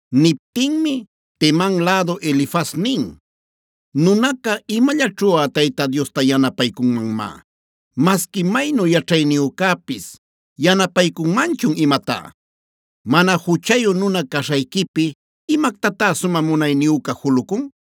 Niptinmi Teman lädu Elifaz nin: “¿Nunaca imallaćhuꞌa Tayta Diosta yanapaycunmanmá? ¿Masqui maynu yaćhayniyücäpis yanapaycunmanchun imatá? ¿Mana juchayu nuna caśhayquipi imactatá sumä munayniyüca julucun?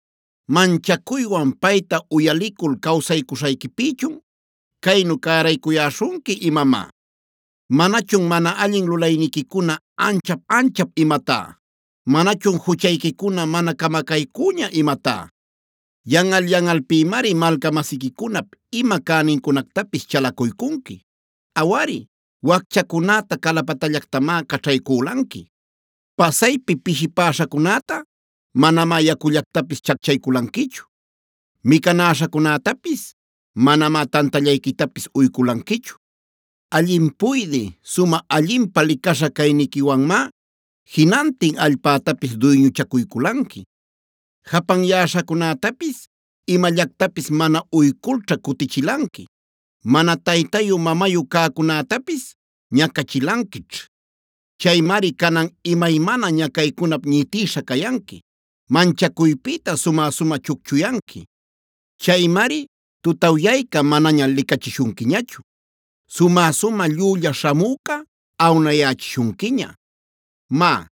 ¿Manchacuywan payta uyalicul cawsaycuśhayquipïchun caynu cäraycuyäśhunqui imamá? ¿Manachun mana allin lulayniquicuna ancha-anchap imatá? ¿Manachun juchayquicuna mana camacaycüña imatá? “Yanꞌal-yanꞌalpïmari malca-masiquicunap ima cänincunactapis chalacuycunqui. Awari, wacchacunäta calapatallactamá caćhaycülanqui. Pasaypi pishipäśhacunäta manamá yacullactapis chacchayculanquichu; micanäśhacunätapis manamá tantallayquitapis uyculanquichu. Allin puydï, sumä allinpä licaśha cayniquiwanmá jinantin allpätapis duyñuchacuyculanqui. Japanyäśhacunätapis imallactapis mana uyculćha cutichilanqui; mana taytayu-mamayu cäcunätapis ñacachilanquićh. Chaymari canan imaymana ñacaycunap ñitïsha cayanqui; manchacuypïta sumä-sumä chucchuyanqui. Chaymari tutawyayca manaña licachishunquiñachu; sumä-sumä llülla śhamüca awnayächishunquiña. “Má,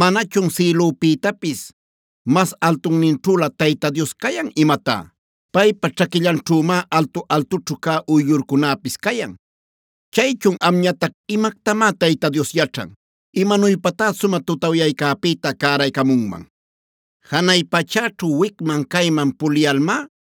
¿manachun sïlüpïtapis mas altunninćhülä Tayta Dios cayan imatá? Paypa ćhaquillanćhümá altu-altućhu cä uyllurcunäpis cayan. Chaychun amñatac: ‘¿Imactamá Tayta Dios yaćhan? ¿Imanuypatá sumä tutawyaycäpïta cäraycamunman? Janay pachäćhu wicman-cayman puliyalmá,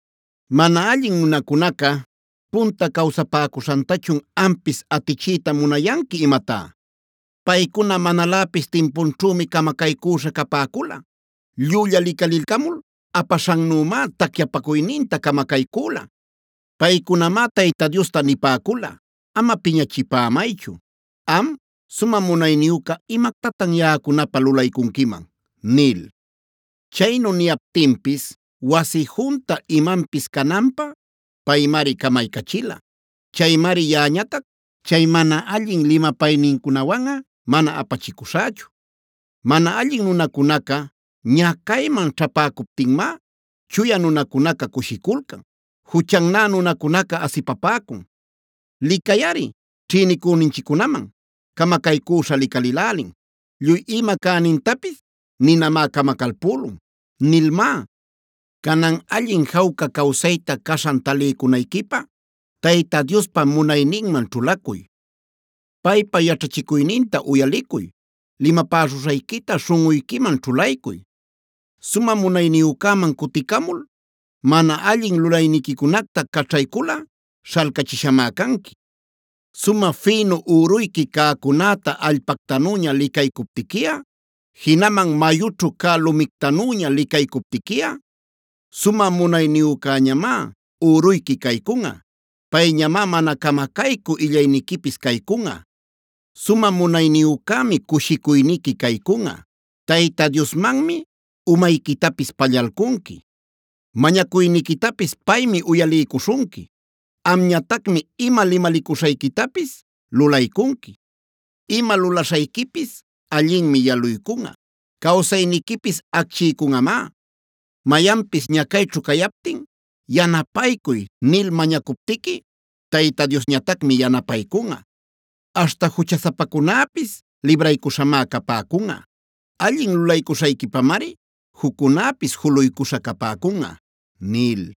“¿Mana allin nunacunaca punta cawsapäcuśhantachun ampis atichiyta munayanqui imatá? Paycuna manaläpis timpunćhümi camacaycüśha capäcula; llülla licalilcamul apaśhannümá tacyapacuyninta camacaycüla. Paycunamá Tayta Diosta nipäcula: ‘¡Ama piñachipämaychu! ¿Am, Sumä Munayniyüca imactatan yaꞌacunapä lulaycunquiman?’ nil. Chaynu niyaptinpis wasi junta imanpis cananpä paymari camaycachila. Chaymari yaꞌañatac, chay mana allin limapaynincunawanꞌa mana apachicuśhächu. Mana allin nunacunaca ñacayman ćhäpäcuptinmá chuya nunacunaca cushiculcan. Juchannä nunacunaca asipapäcun: ‘Licayꞌari, ćhïnicüninchiccunam camacaycüśha licalïlälin; lluy ima cänintapis ninamá camacalpülun’ nilmá. “Canan, allin jawca cawsayta caśhan taliycunayquipä Tayta Diospa munayninman ćhulacuy. Paypa yaćhachicuyninta uyalicuy; limapäśhuśhayquita śhunꞌuyquiman ćhulaycuy. Sumä Munayniyücäman cuticamul, mana allin lulayniquicunacta caćhayculꞌa śhalcachishamá canqui. Sumä fïnuc üruyqui cäcunäta allpactanüña licaycuptiquiꞌa, jinaman mayućhu cä lumictanüña licaycuptiquiꞌa, Sumä Munayniyücäñamá üruyqui caycunꞌa; payñamá mana camacaycü illayniquipis caycunꞌa. Sumä Munayniyücämi cushicuyniqui caycunꞌa; Tayta Diosmanmi umayquitapis pallalcunqui. Mañacuyniquitapis paymi uyaliycuśhunqui; amñatacmi ima limalicuśhayquitapis lulaycunqui. Ima lulaśhayquipis allinmi yaluycunꞌa; cawsayniquipis acchiycunꞌamá. Mayanpis ñacayćhu cayaptin: ‘Yanapaycuy’ nil mañacuptiqui, Tayta Diosñatacmi yanapaycunꞌa. Aśhta juchasapacunäpis libraycuśhamá capäcunꞌa. Allin lulaycuśhayquipamari juccunäpis juluycuśha capäcunꞌa” nil.